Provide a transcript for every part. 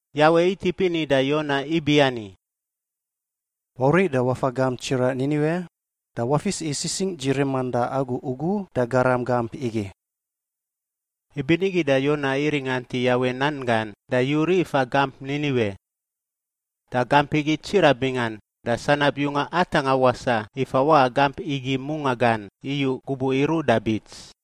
Yawe itip ini da Yona ibiani, “Wauriꞌ da wafa gamp tsiraꞌ Niniwe da wafis i sisingꞌ dzi riman da agu ugu da garam gamp igi.” Ibinigi da Yona iringant i Yawe nan gan da yuriꞌ ifa gamp Niniwe. Da gamp igi tsiraꞌ bingan, da sanab yunga atangꞌa wasaꞌ i fawaꞌa gamp igi mungaꞌ gan iyu gubuꞌ iruꞌ da bits.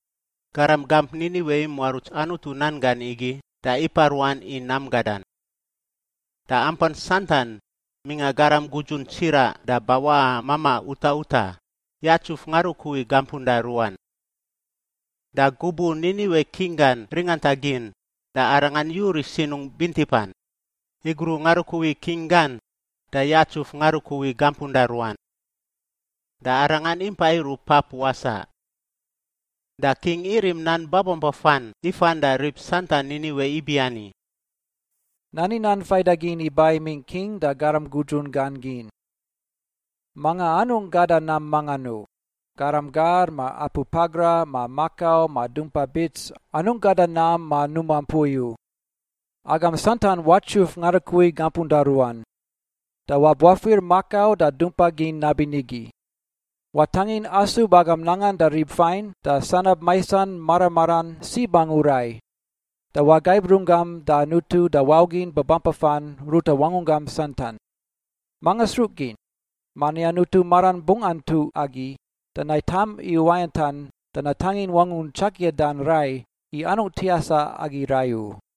Garam gamp Niniwe imuaruts Anutu nan gan igi da ipaꞌ ruan i nam gadan. Da ampan santan — mingꞌa garam gudzun tsiraꞌ da bawaꞌa mamaꞌ utaꞌ utaꞌ — yatsuf ngarukui gampunda ruan. Da gubuꞌ Niniwe king gan ringanta gin, da arangan yuriꞌ sinungꞌ bintipan, igruꞌ ngarukui king gan da yatsuf ngarukui gampunda ruan. Da arangan impa iruꞌ pap wasaꞌ. Da king irim nan babampafan ifan da rib santan Niniwe ibiani: “Nani nan faidagin iba imingꞌ king da garam gudzun gan gin: Manga anungꞌ gada nam mangan u — garam gar ma apu pakra ma makau ma dumpa bits anungꞌ gada nam ma numa mpui u. Agam santan watsuf ngarukui gampunda ruan, da wabuafir makau da dumpa gin nabinigi. Watangin asub agam nangan da rib fain da sanab maisan mara maran sib angu rai. Da wagaib runggam da Anutu da wau gin babampafan ruta wangunggam santan. Manga sruꞌ gin? Mani Anutu maran bungꞌ antuꞌ agi da naitam i uwayantan, da natangin wangun tsakiadan rai i anungꞌ tiasa agi rai u.”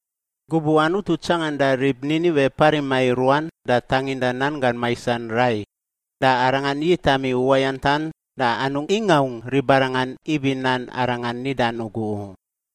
Gubuꞌ Anutu tsanganda rib Niniwe parima i ruan da tanginda nanggan maisan rai, da Arangan yitam i uwayantan da anungꞌ ingaungꞌ ribarangan ibi nan Arangan nidan ugu u.